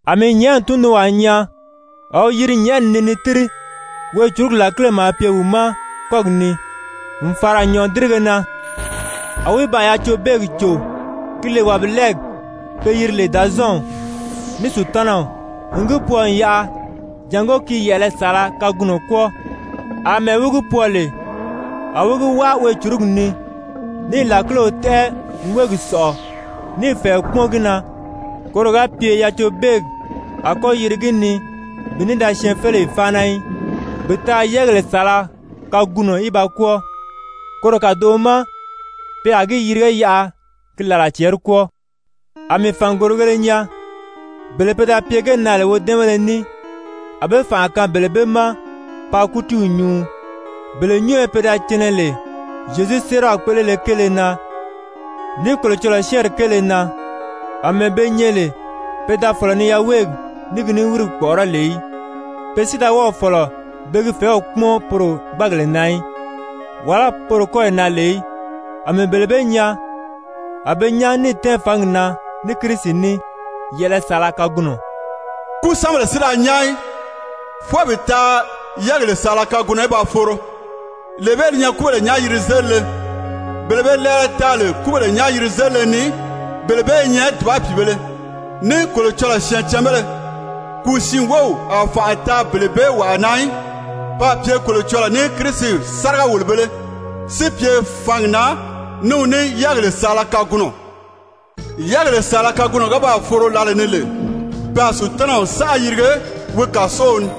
A mii nyɛ̀ʔɛni tundunwaa nyaa a wi yiri nyɛ̀ʔɛni ni ni tíri, weecurugi làkile maa pye wi ma kɔ́gi ni n fàra nyɔ̀ʔɔdirige na. A wi baa yacobeegi cò, ki lè wàbilɛɛgi pe yiri lè Dàzɔɔnw, ní Sutanaw, n gi pwɔɔ n yaʔa jàngó ki yɛ̀ʔɛlɛ saala kagunɔ kwɔ́ɔ. Amɛɛ wi gi pwɔɔ lè, a wi gi wáa weecurugi ni, níì làkilew tɛ́ʔɛ n wéegi sɔ̀ʔɔ níì fɛ̀ɛ kpúmɔn gi na, koro ga pye yacobeegi a kɔ́ yiri gi ni bi ní da syɛɛnfeleyi fáana í, bi taa yɛ́ɛgèle saala kagunɔ í ba kwɔ́ɔ. Koro kàdoʔo ma pe a gi yirige yaʔa ki làla cɛɛri kwɔ́ɔ. A mii fàngorigēle nyaa. Bele pe da pye ge na lè wodɛ́ɛnbéle ní, a be fànʔa kaan bele bee ma paa kútiiw nyuu. Bele nyúnyo pe da cɛnɛ lè Zyezu séeraw kpéʔelele kéele na, ní Kolocɔlɔɔ syɛ́ɛnri kéele na, àmɛɛ be nyɛ lè pe da fɔ̀lɔ ni yaweegi ní ki niwirigi kpɔ̀ʔɔrɔ́ lè í, pe si da wɔ́ɔ̀ fɔ̀lɔ be gi fɛ̀ɛ́w kpúmɔn poro gbáagèle na, wàlá poro kɔ́yi na lè í, a mii bele bee nyaa, a be nyán níì tɛ́ɛn fǎngi na ní Kirisi ní yɛ̀ʔɛlɛ saala kagunɔ. Kúsanbèle si da nyán í, fwɔɔ bi taa yɛ́ɛgèle saala kagunɔ í ba foro. Lee bee li nyɛ kúbèle nyán-yiri-zélile. Bele be lɛɛlɛ taa lè kúbèle nyán-yiri-zélile ni, bele bee i nyɛ dùba pìibēle, ní Kolocɔlɔɔ syɛɛncanbéle! Kùu siin wów a fànʔa taa bele bee wàa na í, pe a pye Kolocɔlɔɔ ní Kirisi sáriga-wòlobēle, si pye fǎngi na ní wi ní yɛ́ɛgèle saala kagunɔ. Yɛ́ɛgèle saala kagunɔ ga baa foro lǎlee ni lè, pe a Sutanaw sánʔa yirige wi kàsow ni.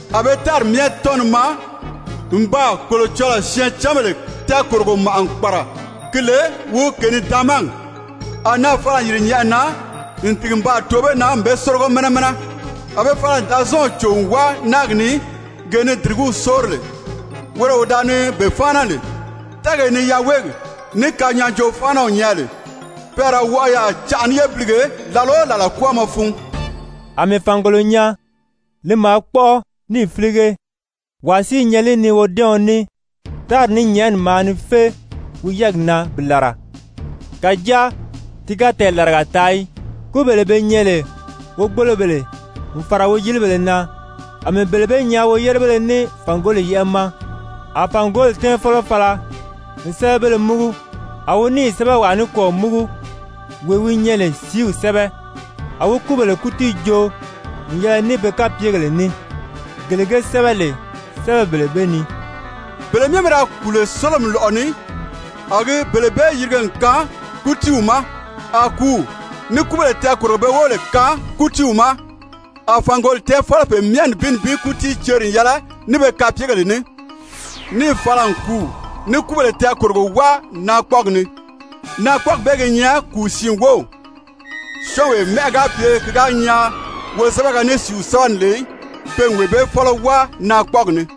A be tári myɛ tɔ́n ni maa n baa Kolocɔlɔɔ syɛɛncanbèle tɛɛkòrogo màʔa n kpàra ki lè wi kènidaamagi. A naà fala n yìri nyɛ̀ʔɛni na n tìgi n baa too be na n be sórigo mɛnɛ mɛnɛ. A be fala n Dàzɔɔnw cò n wáa náagi ni gee ni dìrigíw sóori lè, woro wee wi da ni be fáana lè, tɛɛgee ni yaweegi ní kanyaajoo-fáanaw nyɛ lè. Pe a ra wɔʔɔ yaà canʔa ní yébilige làla o làla kwɔ́ɔmɔ fun. A mii fàngolo nyaa, li maa kpɔ́ʔɔ níì fílige, wàa si i nyɛ li ni wodɛ́ɛɔn ní. Tári ní nyɛ̀ʔɛni maa ni fé wi yɛ́ɛgi na bi làra, kàjáa ti ga tɛɛlaraga taa í. Kúbèle be nyɛ lè wogbolobèle n fàra woyilibèle na, a mii bele bee nyaa woyérebéle ní fàngoli yɛ́ʔɛ ma. A fàngoli tɛ́ɛnfɔlɔ fala n sɛ́bɛbéle múgu, a wi níì sɛ́bɛwaa nikwɔɔ múgu, wee wi nyɛ lè sìíw sɛ́bɛ. A wi kúbèle kútii joo n yɛlɛ ní be kapyegèle ní, gele ge sɛ́bɛ lè sɛ́bɛbèle bee ni. Bele myɛ pe da kùu lè sólomi lɔ̀ʔɔ ni, a gi bele bee yirige n kaan kútiiw ma, a kùúw ní kúbèle tɛɛkòrogo be wóbèle kaan kútiiw ma, a fàngoli tɛ́ɛnfɔlɔ pe myɛ nibin nibin kútii ceri n yɛlɛ ní pe kapyegèle ní, níì fala n kùúw ní kúbèle tɛɛkòrogo wáa naakpɔɔgi ni. Naakpɔɔgi bee gi nyɛ kùu siin wów. Syɔ́ɔnwee mɛ́ʔɛ ga pye ki ga nyaa wozɛbɛgɛ ní sìíw sɛ́bɛ ni lè í, pe n wee bee fɔ́lɔ wáa naakpɔɔgi ni.